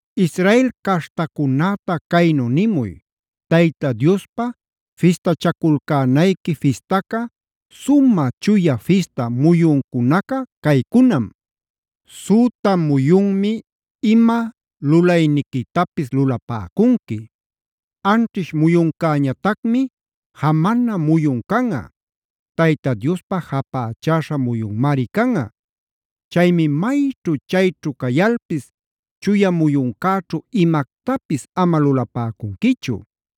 “Israel caśhtacunäta caynu nimuy. Tayta Diospa fistachaculcänayqui fistaca, sumä chuya fista muyuncunaca caycunam: “ ‘Süta muyunmi ima lulayniquitapis lulapäcunqui. Anćhish muyuncäñatacmi jamana muyun canꞌa;a Tayta Diospä japächäśha muyunmari canꞌa. Chaymi mayćhu chayćhu cayalpis chuya muyuncäćhu imactapis ama lulapäcunquichu.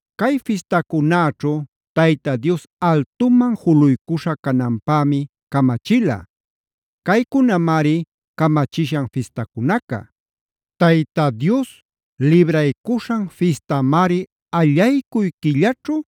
“ ‘Cay fistacunäćhu Tayta Dios altuman juluycuśha cananpämi camachila. Caycunamari camachishan fistacunaca: “ ‘Tayta Dios Libraycuśhan Fistamari allaycuy quillaćhu,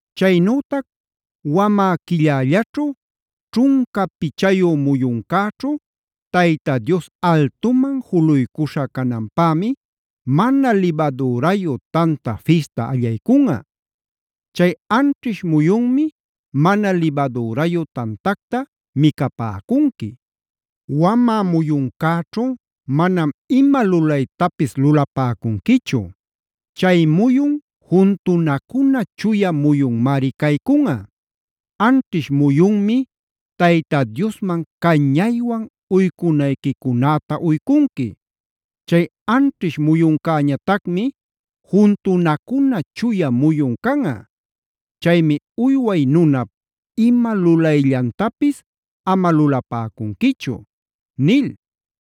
“ ‘Chaynütac wamä quillällaćhu ćhunca pichayu muyuncäćhu Tayta Dios altuman juluycuśha cananpämi Mana Libadürayu Tanta Fistac allaycunꞌa. Chay anćhish muyunmi mana libadürayu tantacta micapäcunqui. Wamä muyuncäćhu manam ima lulaytapis lulapäcunquichu; chay muyun juntunacuna chuya muyunmari caycunꞌa. Anćhish muyunmi Tayta Diosman cañaywan uycunayquicunäta uycunqui. Chay anćhish muyuncäñatacmi juntunacuna chuya muyun canꞌa. Chaymi uyway nunap ima lulayllantapis ama lulapäcunquichu’” nil.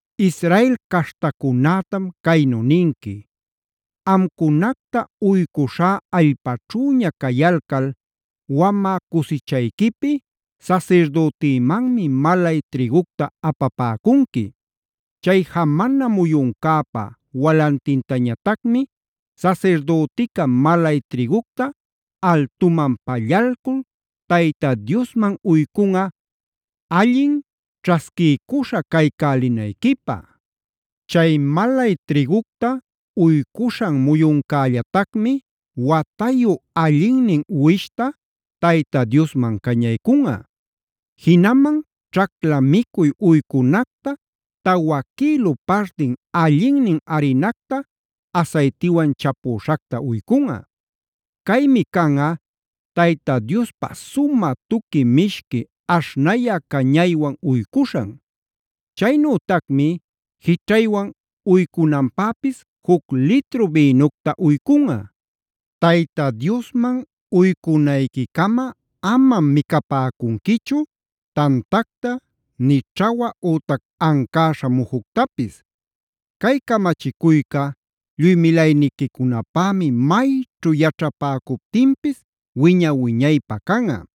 “Israel caśhtacunätam caynu ninqui: ‘Amcunacta uycuśhá allpäćhüña cayalcal wamä cusichayquipi sasirdütimanmi malay trïgucta apapäcunqui. Chay jamana muyuncäpa walantintañatacmi sasirdütica malay trïgucta altuman pallalcul Tayta Diosman uycunꞌa allin ćhasquiycuśha caycälinayquipä. Chay malay trïgucta uycuśhan muyuncällatacmi watayu allinnin uwishta Tayta Diosman cañaycunꞌa. Jinaman ćhacla micuy uycunacta tawa quïlu partin allinnin arinacta asaytiwan chapüśhacta uycunꞌa. Caymi canꞌa Tayta Diospä sumä tuqui mishqui aśhnayä cañaywan uycuśhan. Chaynütacmi jićhaywan uycunanpäpis juc litru bïnucta uycunꞌa. Tayta Diosman uycunayquicama amam micapäcunquichu tantacta nï ćhawa ütac ancäśha mujuctapis. Cay camachicuyca lluy milayniquicunapämi mayćhu yaćhapäcuptinpis wiña-wiñaypä canꞌa.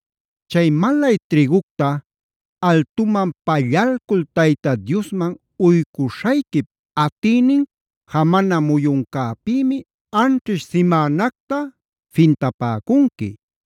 “ ‘Chay malay trïgucta altuman pallalcul Tayta Diosman uycuśhayquip atïnin jamana muyuncäpïmi anćhish simänacta fintapäcunqui.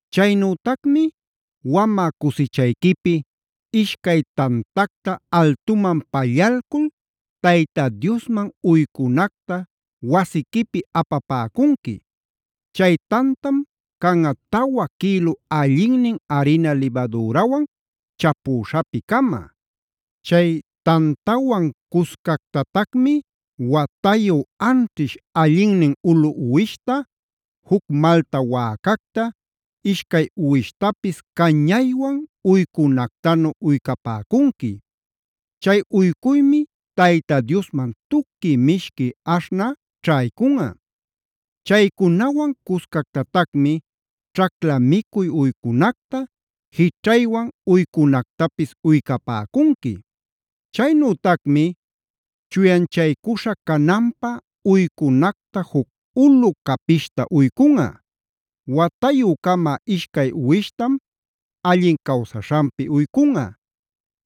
Chaynütacmi wamä cusichayquipi ishcay tantacta altuman pallalcul Tayta Diosman uycunacta wasiquipi apapäcunqui. Chay tantam canꞌa tawa quïlu allinnin arina libadürawan chapüśhapi-cama. Chay tantawan cuscactatacmi watayu anćhish allinnin ulu uwishta, juc malta wäcacta, ishcay uwishtapis cañaywan uycunactanu uycapäcunqui. Chay uycuymi Tayta Diosman tuqui mishqui aśhnä ćhaycunꞌa. Chaycunawan cuscactatacmi ćhacla micuy uycunacta, jićhaywan uycunactapis uycapäcunqui. “ ‘Chaynütacmi chuyanchaycuśha cananpä uycunacta juc ulu capishta uycunꞌa. Watayü-cama ishcay uwishtam allin cawsaśhanpi uycunꞌa.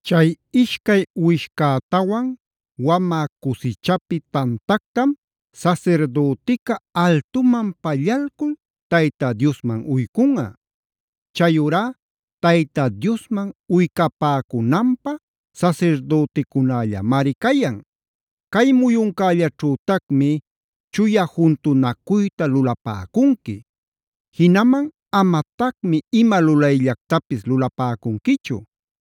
Chay ishcay uwishcätawan wamä cusichapi tantactam sasirdütica altuman pallalcul Tayta Diosman uycunꞌa. Chayurá Tayta Diosman uycapäcunanpä sasirdüticunällamari cayan. “ ‘Cay muyuncällaćhütacmi chuya juntunacuyta lulapäcunqui. Jinaman amatacmi ima lulayllactapis lulapäcunquichu.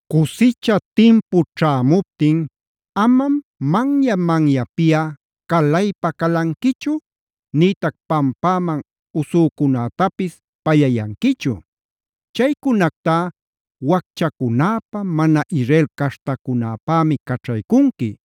“ ‘Cusicha timpu ćhämuptin amam manya-manyapiꞌa calaypa-calanquichu nïtac pampäman usücunätapis pallayanquichu. Chaycunactá wacchacunäpä, mana Israel caśhtacunäpämi caćhaycunqui.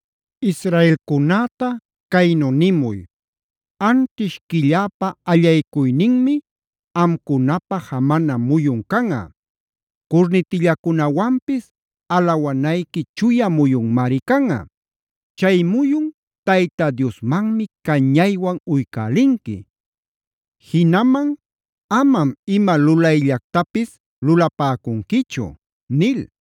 “Israelcunäta caynu nimuy: ‘Anćhish quilläpa allaycuyninmi amcunapä jamana muyun canꞌa; curnitillacunawanpis alawanayqui chuya muyunmari canꞌa. Chay muyun Tayta Diosmanmi cañaywan uycälinqui. Jinaman amam ima lulayllactapis lulapäcunquichu’” nil.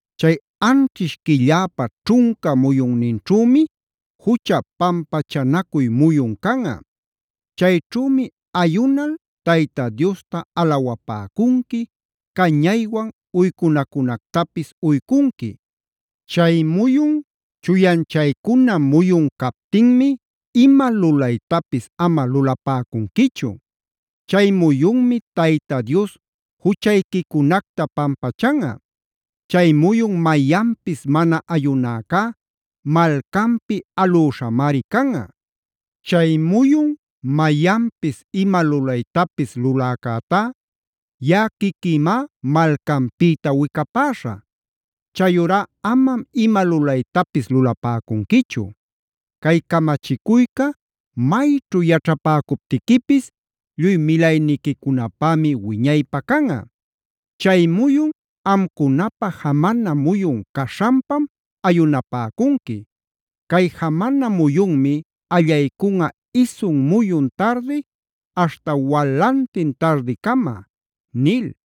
“Chay anćhish quilläpa ćhunca muyunninćhümi jucha pampachanacuy muyun canꞌa. Chayćhümi ayunal Tayta Diosta alawapäcunqui, cañaywan uycunacunactapis uycunqui. Chay muyun chuyanchaycuna muyun captinmi ima lulaytapis ama lulapäcunquichu. Chay muyunmi Tayta Dios juchayquicunacta pampachanꞌa. Chay muyun mayanpis mana ayunäcá malcanpi alüśhamari canꞌa. Chay muyun mayanpis ima lulaytapis luläcätá yaꞌa quiquïmá malcanpïta wicapäśhä. “Chayurá amam ima lulaytapis lulapäcunquichu. Cay camachicuyca mayćhu yaćhäpäcuptiquipis lluy milayniquicunapämi wiñaypä canꞌa. Chay muyun amcunapä jamana muyun caśhanpam ayunapäcunqui. Cay jamana muyunmi allaycunꞌa isun muyun tardi aśhta walantin tardicama” nil.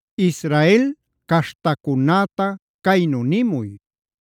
“Israel caśhtacunäta caynu nimuy: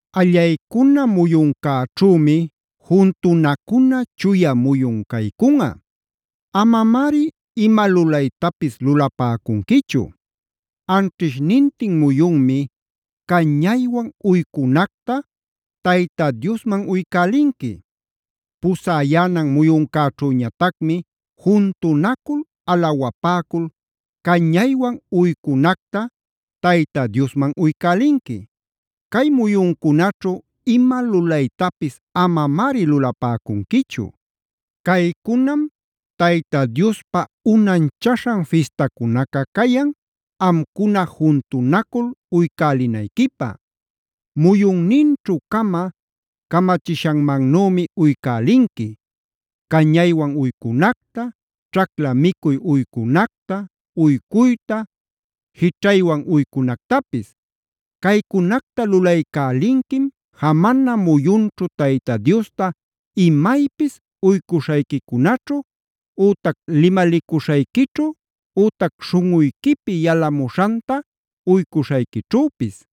Allaycuna muyuncäćhümi juntunacuna chuya muyun caycunꞌa. Amamari ima lulaytapis lulapäcunquichu. Anćhishnintin muyunmi cañaywan uycunacta Tayta Diosman uycälinqui. Pusäyänan muyuncäćhüñatacmi juntunacul, alawapäcul cañaywan uycunacta Tayta Diosman uycälinqui. Cay muyuncunaćhu ima lulaytapis amamari lulapäcunquichu. “ ‘Caycunam Tayta Diospä unanchaśhan fistacunaca cayan, amcuna juntunacul uycälinayquipä. Muyunninćhu-cama camachishanmannümi uycälinqui: cañaywan uycunacta, ćhacla micuy uycunacta, uycuyta, jićhaywan uycunactapis. Caycunacta lulaycälinquim jamana muyunćhu Tayta Diosta imaypis uycuśhayquicunaćhu ütac limalicuśhayquićhu ütac śhunꞌuyquipi yalamuśhanta uycuśhayquićhüpis.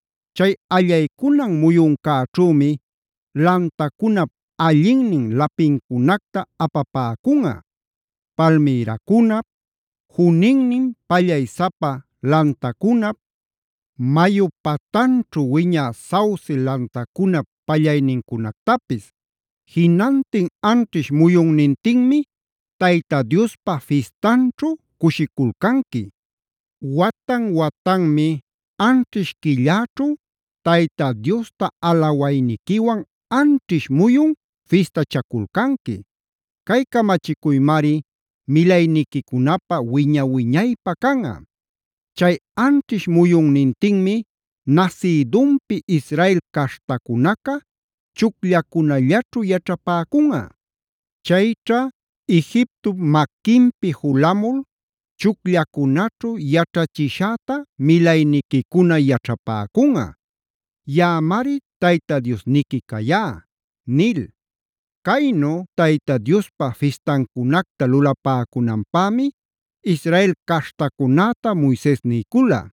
Chay allaycunan muyuncäćhümi lantacunap allinnin lapincunacta apapäcunꞌa: palmïracunap, juninnin pallaysapa lantacunap, mayu patanćhu wiñä sauce lantacunap pallaynincunactapis. Jinantin anćhish muyunnintinmi Tayta Diospa fistanćhu cushiculcanqui. Watan-watanmi anćhish quilläćhu Tayta Diosta alawayniquiwan anćhish muyun fistachaculcanqui. Cay camachicuymari milayniquicunapä wiña-wiñaypä canꞌa. Chay anćhish muyunnintinmi nasïdunpi Israel caśhtacunaca chucllacunallaćhu yaćhapäcunꞌa. Chayćha Egiptop maquinpi julamul chucllacunaćhu yaćhachishäta milayniquicuna yaćhapäcunꞌa. Yaꞌamari Tayta Diosniqui cayá’” nil. Caynu Tayta Diospa fistancunacta lulapäcunanpämi Israel caśhtacunäta Moises niycula.